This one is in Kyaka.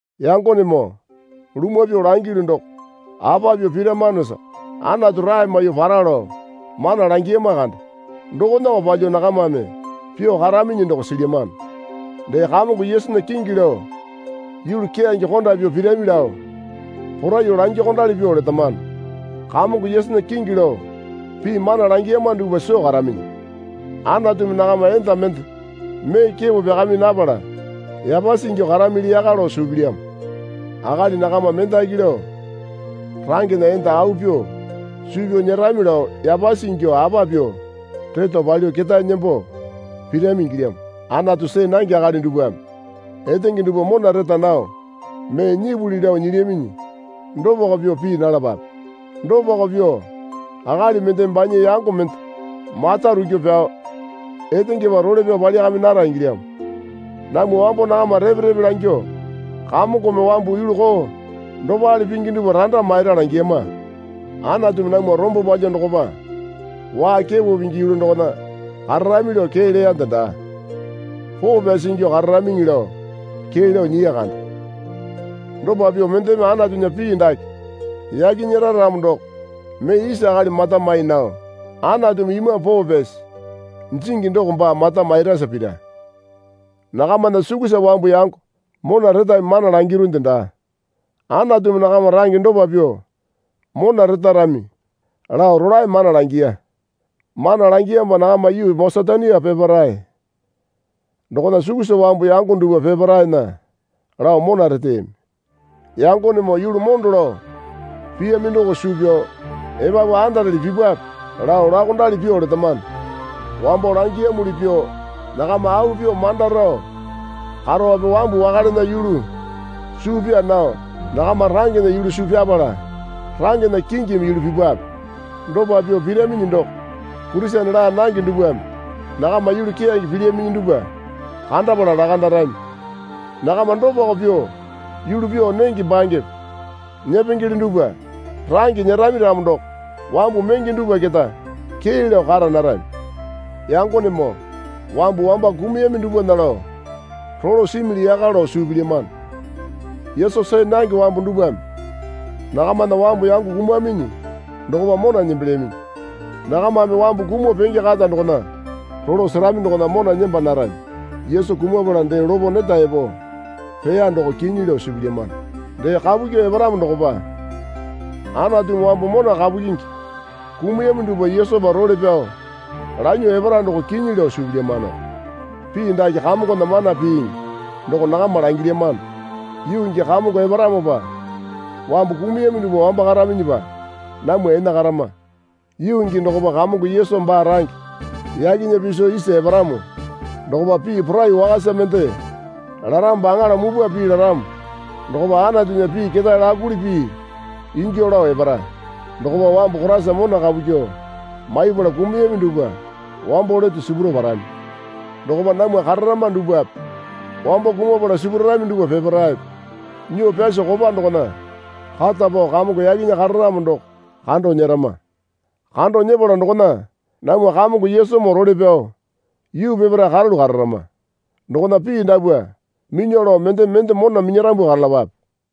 Yangonemoo lumwa pyuo langilyu doko apa pyuo piramanosa Anatu rae maiyuo para lao mana langiyama kande. Dokonako palyuo nakamame pyuo karaminyi doko silyamano. Dee Kamongo Yesunya kingi lao yulu keyange konda pyuo pirami lao poraiyuo langyuokondali pyuo letamano. Kamongo Yesunya kingi lao pii mana langiyama dupwa soo karaminyi. Anatumi nakama enda mende mee kepo pyakami napala yapasi ingyuo karamili yaka lao suu pilyamo. Akali nakama mendaki lao rangena enda au pyuo suu pyao nyerami lao yapasi ingyuo apa pyuo reto palyuo ketae nembo pirami ingilyamo. Anatu see nange akali dupwame etenge dupwa mona reta nao mee nyipuli lao nyilyaminyi dopako pyuo pii nalapape. Dopako pyuo akali mendeme banya yango mende mata rukyuo pyao etengepa role pyao palyakami nara ingilyamo. Namwa wambo nakama repe repe langyuo Kamongome wambu yulu koo dopale pingi dupwa randa maira langiyama. Anatumi namwa rombo palyuo dokopa waa kepo pingi yulu dokona kararami lao kee leyande daa. Poo pyasi ingyuo kararamiŋi lao kee lao nyiya kande. Dopa pyuo mendeme Anatunya pii dake yake nyera ramo doko mee isa akali mata mai nao Anatumi Imambu Poo Pyasi jingi doko baa mata mairasa pira. Nakamana sukusa wambu yango mona retami mana langirunde daa. Anatumi nakama range dopa pyuo mona retarami lao rolae mana langiya. Mana langiyamopa nakama yuu Masetonia peparae dokona sukusa wambu yango dupwa peparaena lao mona reteyami. Yangonemoo yulu mondo lao piyami doko suu pyao epapu andarele pipwape lao laokondali pyuo letamano. Wambo langiyamuli pyuo nakama au pyuo manda rao karope wambu wakalena yulu suu pyaa nao nakama rangena yulu suu pyapala rangena kingimi yulu pipwape. Dopa pyuo piraminyi doko Kurisene laa nange dupwame nakama yulu keyange pilyaminyi dupwa kandapala lakandarami. Nakama dopako pyuo yulu pyuo nenge bangepe nyepengele dupwa range nyerami ramo doko wambu menge dupwa keta kee lao kara narami. Yangonemoo wambu wamba kumuyami dupwana lao rolo simili yaka lao suu pilyamano. Yesu see nange wambu dupwame nakamana wambu yango kumaminyi dokopa mona nembelyaminyi. Nakamame wambu kumuo penge kata dokona rolo serami dokona mona nemba narami. Yesu kumapala dee lopo neta epo peya doko kinyi lao suu pilyamano. Dee kapu kyuo eparamo dokopa Anatumi wambu mona kapu kyingi kumuyami dupwa Yesupa role pyao lanyuo epara doko kinyi lao suu pilyamanoko. Pii dake Kamongona mana piiŋi doko nakama langilyamano. Yuu gii Kamongo eparamopa wambu kumuyami dupwa wamba karaminyipa namwa enakarama. Yuu gii dokopa Kamongo Yesu baa range yakena piso isa eparamo dokopa pii poraiyuo wakasa mende laramopa aŋala mupwa pii laramo dokopa Anatunya pii ketae lakuli pii ingyuo lao epara. Dokopa wambu Koraisa mona kapu kyuo maipala kumuyami dupwa wambo lete sipuro parami. Dokopa namwa kararama dupwape wambo kumapala sipurarami dupwa peparaepe nyuo pyaso kopa dokona kata pao Kamongo yakena kararamo doko kando nyerama. Kando nyepala dokona namwa Kamongo Yesumoo role pyao yuu peparae karalu kararama. Dokona pii dapwa minyuo lao mendeme mende mona minyarambu karalapape.